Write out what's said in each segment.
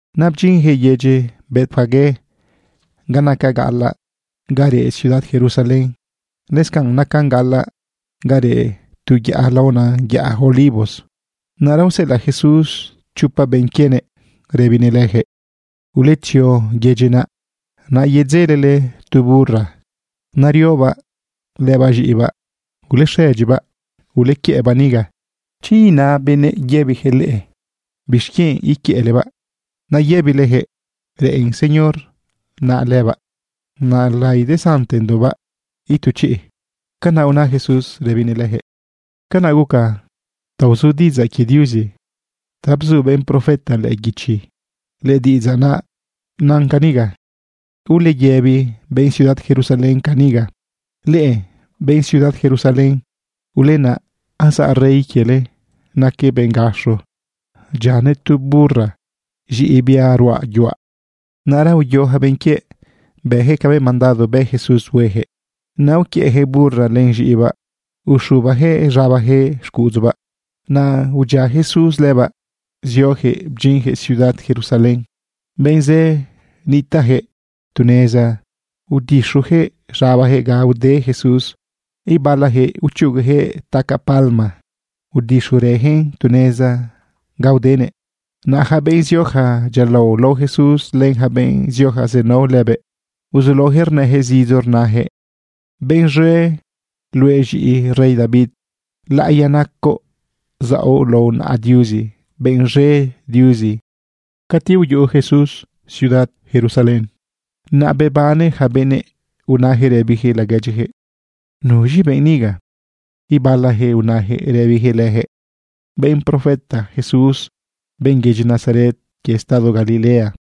Naꞌ bdyinjëꞌ yedyi Betfagé ga nacan gaꞌalaꞌ ga reꞌ ciudad Jerusalén. Lëscanꞌ nacan gaꞌalaꞌ ga reꞌ tu yaꞌa laona yaꞌa Olivos. Naꞌra useꞌelaꞌ Jesús chopa benꞌ quienëꞌ rëbinëꞌ lëjëꞌ: ―Uletzio yedyi naꞌ. Naꞌ yedzelele tu burra neriobaꞌ lëbaꞌ z̃iꞌibaꞌ. Ulexëdyibaꞌ ulequiëꞌbaꞌ niga. Chi ina benëꞌ rëbijëꞌ leꞌe: “¿Bixquienꞌ iquiëꞌlebaꞌ?” naꞌ yëbilejëꞌ: “Reꞌen Señor naꞌ lëbaꞌ. Naꞌ laidesantendoꞌbaꞌ itu chiꞌ.” ―Canaꞌ una Jesús rëbinëꞌ lëjëꞌ. Canaꞌ guca ta uzu diꞌidzaꞌ quie Diuzi ta bzu benꞌ profeta lëꞌë guichi. Lëdiꞌidzaꞌ nan caniga: Uleyëbi benꞌ ciudad Jerusalén caniga: “Leꞌe benꞌ ciudad Jerusalén, ulenaꞌ, azaꞌ rey quiele, naquëꞌ benꞌ gaxo, dyianëꞌ tu burra, z̃iꞌi bia ruꞌa yuaꞌ.” Naꞌra uyo ja benꞌ quiëꞌ, bëjëꞌ cabëꞌ mandado bë Jesús huejëꞌ. Naꞌ uquiëꞌjëꞌ burra len z̃iꞌibaꞌ uxubajëꞌ z̃abajëꞌ xcuꞌudzubaꞌ, naꞌ udyia Jesús lëbaꞌ, ziojëꞌ bdyinjëꞌ ciudad Jerusalén. Benꞌ zë nitaꞌjëꞌ tu neza udixujëꞌ z̃abajëꞌ ga ude Jesús. Ibalajëꞌ uchugujëꞌ tacaꞌ palma udixurëjëꞌn tu neza ga udenëꞌ. Naꞌ ja benꞌ zioja dyialao lao Jesús len ja benꞌ zioja zenao lëbëꞌ, uzulaojëꞌ rnëjëꞌ zidzo rnajëꞌ: ―¡Benꞌ z̃e luëꞌ, z̃iꞌi rey David! Laꞌiya nacoꞌ zaoꞌ lao naꞌa Diuzi. ¡Benꞌ z̃e Diuzi! Cati uyuꞌu Jesús ciudad Jerusalén, naꞌ bebane ja benëꞌ unajëꞌ rëbijëꞌ laguedyijëꞌ: ―¿Nuz̃i benꞌ niga? Ibalajëꞌ unajëꞌ rëbijëꞌ lëjëꞌ: ―Benꞌ profeta Jesús, benꞌ yedyi Nazaret quie estado Galilea.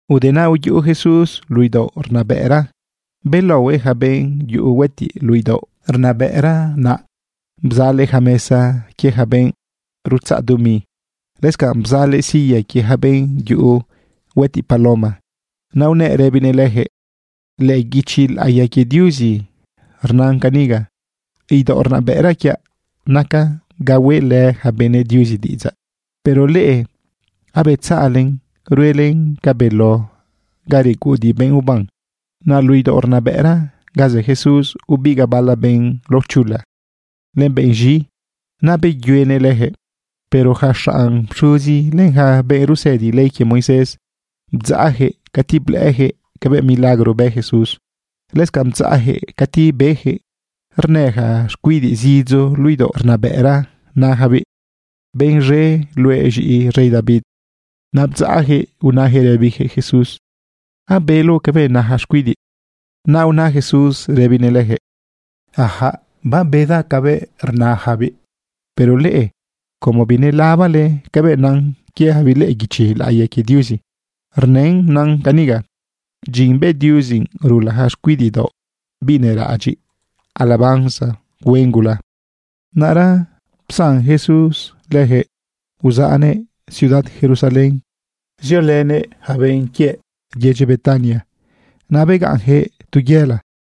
Ude naꞌ uyuꞌu Jesús luꞌu idaoꞌ rnabëꞌra belaohuëꞌ ja benꞌ yuꞌu huëtiꞌ luꞌu idaoꞌ rnabëꞌra naꞌ. Bzalëꞌ ja mesa quie ja benꞌ rutzaꞌ dumi. Lëscanꞌ bzalëꞌ silla quie ja benꞌ yuꞌu huëtiꞌ paloma. Naꞌ unëꞌ rëbinëꞌ lëjëꞌ: ―Lëꞌë guichi laꞌiya quie Diuzi rnan caniga: “Idaoꞌ rnabëꞌra quiaꞌ nacan ga hueꞌlë ja benëꞌ Diuzi diꞌidzaꞌ. Pero leꞌe abetzaꞌlen ruelen ca beló ga reguꞌudiꞌ benꞌ uban.” Naꞌ luꞌu idaoꞌ rnabëꞌra ga zë Jesús, ubigaꞌ bala benꞌ laochula len benꞌ z̃i, naꞌ beyuenëꞌ lëjëꞌ. Pero ja xanꞌ pxuzi len ja benꞌ rusëdi ley quie Moisés, bdzaꞌjëꞌ cati blëꞌëjëꞌ cabëꞌ milagro bë Jesús. Lëscanꞌ bdzaꞌjëꞌ cati bejëꞌ rnë ja xcuidiꞌ zidzo luꞌu idaoꞌ rnabëꞌra najabiꞌ: “Benꞌ z̃e luëꞌ, z̃iꞌi rey David.” Naꞌ bdzaꞌjëꞌ unajëꞌ rëbijëꞌ Jesús: ―¿Abeloꞌ cabëꞌ na ja xcuidiꞌ? Naꞌ una Jesús rëbinëꞌ lëjëꞌ: ―Ajaꞌ, bedaꞌ cabëꞌ rnajabiꞌ. Pero leꞌe, ¿cómo binelabale cabëꞌ nan quiejabiꞌ lëꞌë guichi laꞌiya quie Diuzi? Rnën nan caniga: Dyin bë Diuzi rula ja xcuidiꞌ daoꞌ, biꞌ neraꞌadyiꞌ, alabanza huen gula. Naꞌra psan Jesús lëjëꞌ uzaꞌnëꞌ ciudad Jerusalén ziolënëꞌ yaca benꞌ quiëꞌ yedyi Betania. Naꞌ begaꞌnjëꞌ tu yela.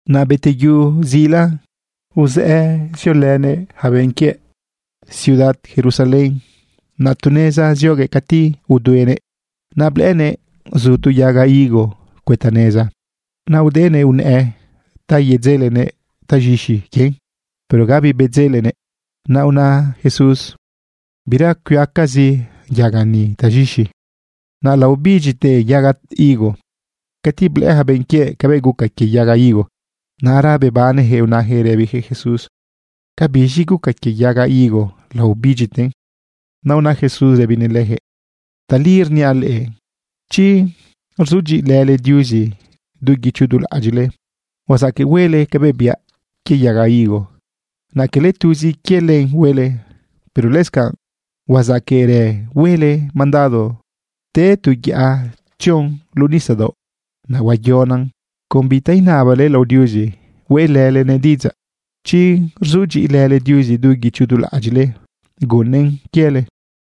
Naꞌ beteyu zila, uzëꞌë ziolënëꞌ yaca benꞌ quiëꞌ ciudad Jerusalén. Naꞌ tu neza zioguëꞌ cati uduenëꞌ. Naꞌ blëꞌënëꞌ zu tu yaga higo cuëta neza. Naꞌ udenëꞌ unëꞌë ta yedzelenëꞌ taz̃ixi quien, pero gabi bedzelenëꞌ. Naꞌ una Jesús: ―Bira cuiacazi yaga ni taz̃ixi. Naꞌ laobidyite yaga higo. Cati blëꞌë ja benꞌ quiëꞌ cabëꞌ guca quie yaga higo, naꞌra bebanejëꞌ unajëꞌ rëbijëꞌ Jesús: ―¿Cabiz̃i guca quie yaga higo laobidyiten? Naꞌ una Jesús rëbinëꞌ lëjëꞌ: ―Tali rniaꞌ leꞌe, chi rzudyiꞌilële Diuzi du guicho du laꞌadyiꞌle, huazaqueꞌ huele cabëꞌ biaꞌ quie yaga higo. Naꞌ quele tuzi quie len huele, pero lëscanꞌ huazaqueꞌrë huele mandado te tu yaꞌa tzion luꞌu nisadaoꞌ, naꞌ huayonan. Con bita inabale lao Diuzi hueꞌlëlenëꞌ diꞌidzaꞌ, chi rzudyiꞌilële Diuzi du guicho du laꞌadyiꞌle, gunnëꞌn quiele.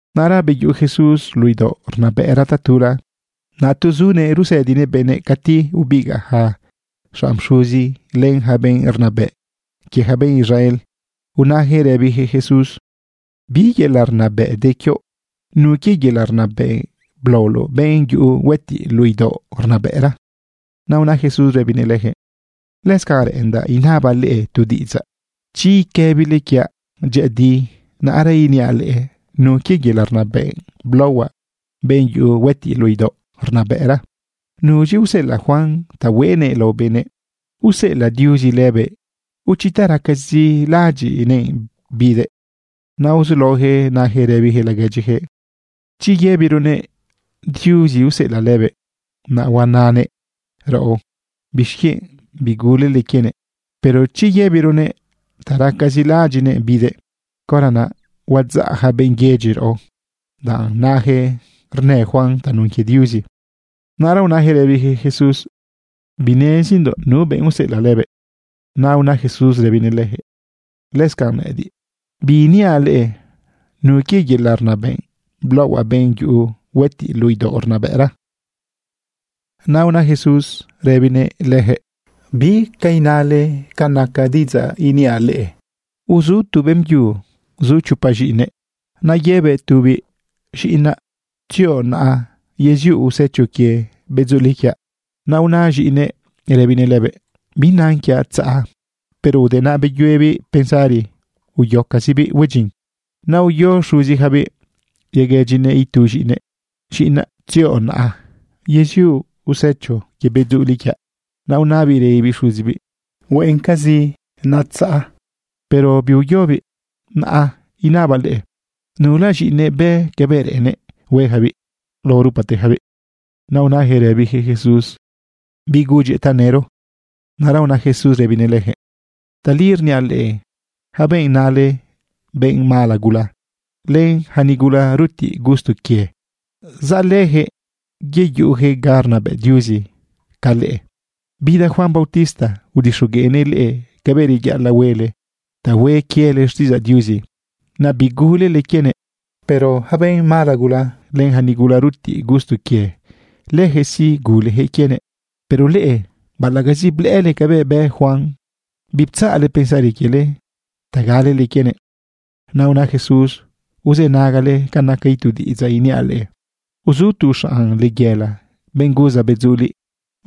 Naꞌra beyuꞌu Jesús luꞌu idaoꞌ rnabëꞌra tatula. Naꞌ tu zunëꞌ rusëdinëꞌ benëꞌ cati ubigaꞌ ja xanꞌ pxuzi, len ja benꞌ rnabëꞌ quie ja benꞌ Israel, unajëꞌ rëbijëꞌ Jesús: ―¿Bi yelaꞌ rnabëꞌ de quioꞌ? ¿Nu quie yelaꞌ rnabëꞌ blaoloꞌ benꞌ yuꞌu huëtiꞌ luꞌu idaoꞌ rnabëꞌra? Naꞌ una Jesús rëbinëꞌ lëjëꞌ: ―Lëscanꞌ reꞌendaꞌ inabaꞌ leꞌe tu diꞌidzaꞌ. Chi iquëbile quiaꞌ dyëꞌëdi, naꞌra iniaꞌ leꞌe nu quie yelaꞌ rnabëꞌ blaohuaꞌ benꞌ yuꞌu huëtiꞌ luꞌu idaoꞌ rnabëꞌra. ¿Nuz̃i useꞌelaꞌ Juan ta hueꞌnëꞌ lao benëꞌ? ¿Useꞌelaꞌ Diuzi lëbëꞌ? ¿O chi ta racazi laꞌadyiꞌnëꞌ bidëꞌ? Naꞌ uzulaojëꞌ najëꞌ rëbijëꞌ laguedyijëꞌ: ―Chi yëbironëꞌ: “Diuzi useꞌelëꞌ lëbëꞌ”, naꞌ huanëꞌ raꞌo: “¿Bixquienꞌ bigulele quienëꞌ?” Pero chi yëbironëꞌ: “Ta racazi laꞌadyiꞌnëꞌ bidëꞌ”, caora naꞌ huadzaꞌ ja benꞌ yedyi raꞌo, danꞌ najëꞌ rnë Juan tanun quie Diuzi. Naꞌra unajëꞌ rëbijëꞌ Jesús: ―Binezindoꞌ nu benꞌ useꞌelaꞌ lëbëꞌ. Naꞌ una Jesús rëbinëꞌ lëjëꞌ: ―Lëscanꞌ nëꞌëdiꞌ, biiniaꞌ leꞌe nu quie yelaꞌ rnabëꞌ blaohuaꞌ benꞌ yuꞌu huëtiꞌ luꞌu idaoꞌ rnabëꞌra. Naꞌ una Jesús lëjëꞌ: ―¿Bi ca inale ca naca diꞌidzaꞌ iniaꞌ leꞌe? Uzu tu beꞌmbyu zu chopa z̃iꞌinëꞌ. Naꞌ yëbëꞌ tubiꞌ: “Z̃iꞌinaꞌ, tzioꞌ naꞌa yeziuꞌ usecho quie bedzuliꞌ quiaꞌ.” Naꞌ una z̃iꞌinëꞌ rëbinëꞌ lëbëꞌ: “¡Binan quiaꞌ tzaꞌa!” Pero ude naꞌ beyuebiꞌ pensari uyocazibiꞌ hue dyin. Naꞌ uyo xuzijabiꞌ yaguëdyinëꞌ itu z̃iꞌinëꞌ: “Ziꞌinaꞌ, tzioꞌ naꞌa yeziuꞌ usecho quie bedzuliꞌ quiaꞌ.” Naꞌ unabiꞌ rëbibiꞌ xuzibiꞌ: “Hueꞌencazi tzaꞌa.” Pero biuyobiꞌ. Naꞌ inabaꞌ leꞌe: ¿Nula z̃iꞌinëꞌ bë cabëꞌ reꞌennëꞌ huejabiꞌ lao rupatejabiꞌ? Naꞌ unajëꞌ rëbijëꞌ Jesús: ―Biꞌ gudyëꞌ tanëro. Naꞌra una Jesús rëbinëꞌ lëjëꞌ: ―Tali rniaꞌ leꞌe, ja benꞌ nale benꞌ mala gula, len ja nigula rutiꞌ gusto quie, zaꞌ lëjëꞌ yeyuꞌujëꞌ ga rnabëꞌ Diuzi ca leꞌe. Bida Juan bautista udixogueꞌnëꞌ leꞌe cabëꞌ reyaꞌalaꞌ huele ta hue quiele xtiꞌidzaꞌ Diuzi, naꞌ bigulele quienëꞌ. Pero yaca benꞌ mala gula len ja nigula rutiꞌ gusto quie, lëjëꞌ sí, gulejëꞌ quienëꞌ. Pero leꞌe baꞌalaꞌcazi blëꞌële cabëꞌ bë Juan, biptzaꞌle pensari quiele ta galele quienëꞌ. Naꞌ una Jesús: ―Uzënagale ca naca itu diꞌidzaꞌ iniaꞌ leꞌe. Uzu tu xanꞌ layela, benꞌ guza bedzuliꞌ.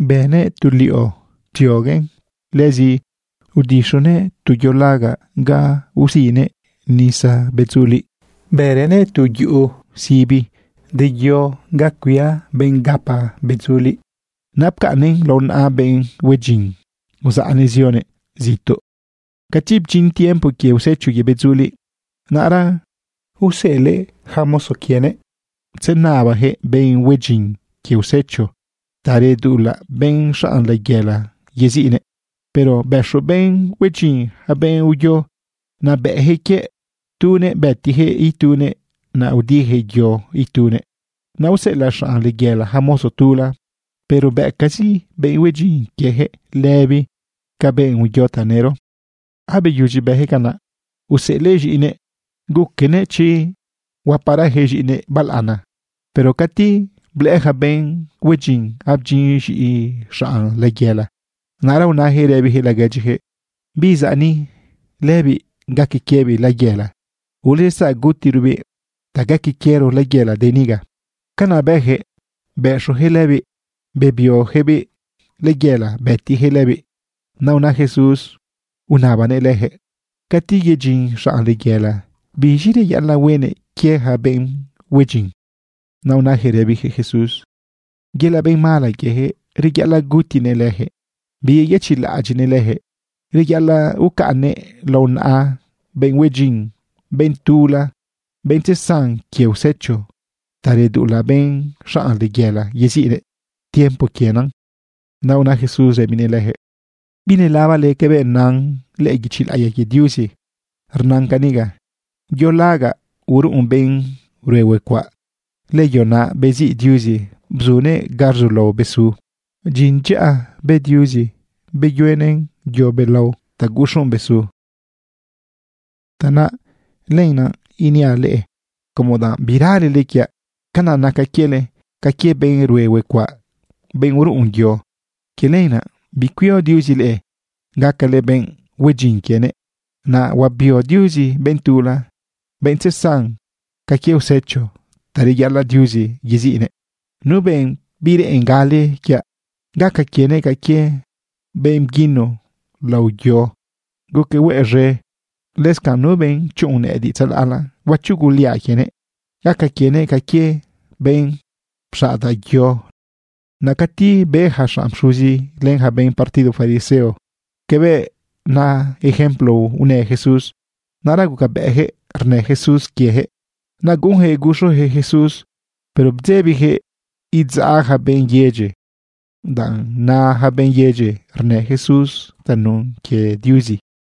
Bënëꞌ tu liꞌo psioguëꞌn. Lëzi udixunëꞌ tu yo lagaꞌ ga usinëꞌ nisa bedzuliꞌ. Bërënëꞌ tu yuꞌu sibi de yo ga cuia benꞌ rapa bedzuliꞌ. ’Naꞌ pcaꞌnnëꞌn lao naꞌa benꞌ hue dyin, uzaꞌnëꞌ zionëꞌ zituꞌ. Cati bdyin tiempo quie usecho quie bedzuliꞌ, naꞌra useꞌelëꞌ ja mozo quienëꞌ tzenabajëꞌ benꞌ hue dyin quie usecho ta reduꞌulaꞌ benꞌ xanꞌ layela yeziꞌnëꞌ. Pero bëxo benꞌ hue dyin ja benꞌ uyo. Naꞌ bëꞌjëꞌ quie tunëꞌ, bëtijëꞌ itunëꞌ, naꞌ udijëꞌ yo itunëꞌ. Naꞌ useꞌelaꞌ xanꞌ layela ja mozo tula. Pero bëcazi benꞌ hue dyin quiejëꞌ lëbi ca benꞌ uyo tanëro. ’Abeyudyi bëjëꞌ canaꞌ, useꞌelëꞌ z̃iꞌinëꞌ, guquenëꞌ chi huaparajëꞌ z̃iꞌinëꞌ balaꞌana. Pero cati blëꞌë ja benꞌ hue dyin abdyin z̃iꞌi xanꞌ layela, naꞌra unajëꞌ rëbijëꞌ laguedyijëꞌ: “Biꞌ zaꞌ ni, lëbiꞌ gaque quiebiꞌ layela. Uletzaꞌ gutirobiꞌ ta gaque quiero layela de niga.” Canaꞌ bëjëꞌ, bëxojëꞌ lëbiꞌ, bebiojabiꞌ layela, bëtijëꞌ lëbiꞌ. Naꞌ una Jesús unabanëꞌ lëjëꞌ: ―Cati yedyin xanꞌ layela, ¿biz̃i reyaꞌalaꞌ huenëꞌ quie ja benꞌ hue dyin? Naꞌ unajëꞌ rëbijëꞌ Jesús: ―Yelaꞌ benꞌ mala quiejëꞌ, reyaꞌalaꞌ gutinëꞌ lëjëꞌ, biyëchiꞌlaꞌadyiꞌnëꞌ lëjëꞌ. Reyaꞌalaꞌ ucaꞌnnëꞌn lao naꞌa benꞌ hue dyin, benꞌ tula, benꞌ tzesan quie usecho ta reduꞌulaꞌ benꞌ xanꞌ layela yeziꞌnëꞌ tiempo quienan. Naꞌ una Jesús rëbinëꞌ lëjëꞌ: ―¿Binelabale cabëꞌ nan lëꞌë guichi laꞌiya quie Diuzi? Rnan caniga: Yo lagaꞌ uruꞌun benꞌ rue huecuaꞌ, lëyo naꞌ beziꞌ Diuzi, bzunëꞌn ga rzulao besu. Dyin dyaꞌa bë Diuzi beyuenëꞌn yo belao ta guxuꞌn besu. Tanaꞌ lenaꞌ iniaꞌ leꞌe, como danꞌ biralele quiaꞌ, canaꞌ naca quiele ca quie benꞌ rue huecuaꞌ, benꞌ uruꞌun yo. Quie lenaꞌ bicuio Diuzi leꞌe gacale benꞌ hue dyin quienëꞌ. Naꞌ huabio Diuzi benꞌ tula, benꞌ tzesan ca quie usecho ta reyaꞌalaꞌ Diuzi yeziꞌnëꞌ. Nu benꞌ bireꞌen gale quiaꞌ, gaca quienëꞌ ca quie benꞌ bguino lao yo, guquëꞌ hueꞌ z̃e. Lëscanꞌ nu benꞌ chuꞌun nëꞌëdiꞌ tzalaꞌla, huachuguliaꞌ quienëꞌ. Gaca quienëꞌ ca quie benꞌ pxaꞌdaꞌ yo lënëꞌ. Naꞌ cati be ja xanꞌ pxuzi len ja benꞌ partido fariseo cabëꞌ na ejemplo unë Jesús, naꞌra gucabëꞌjëꞌ rnë Jesús quiejëꞌ. Naꞌ guꞌunjëꞌ guxujëꞌ Jesús, pero bdzebijëꞌ idzaꞌ ja benꞌ yedyi, danꞌ na ja benꞌ yedyi rnë Jesús tanun quie Diuzi.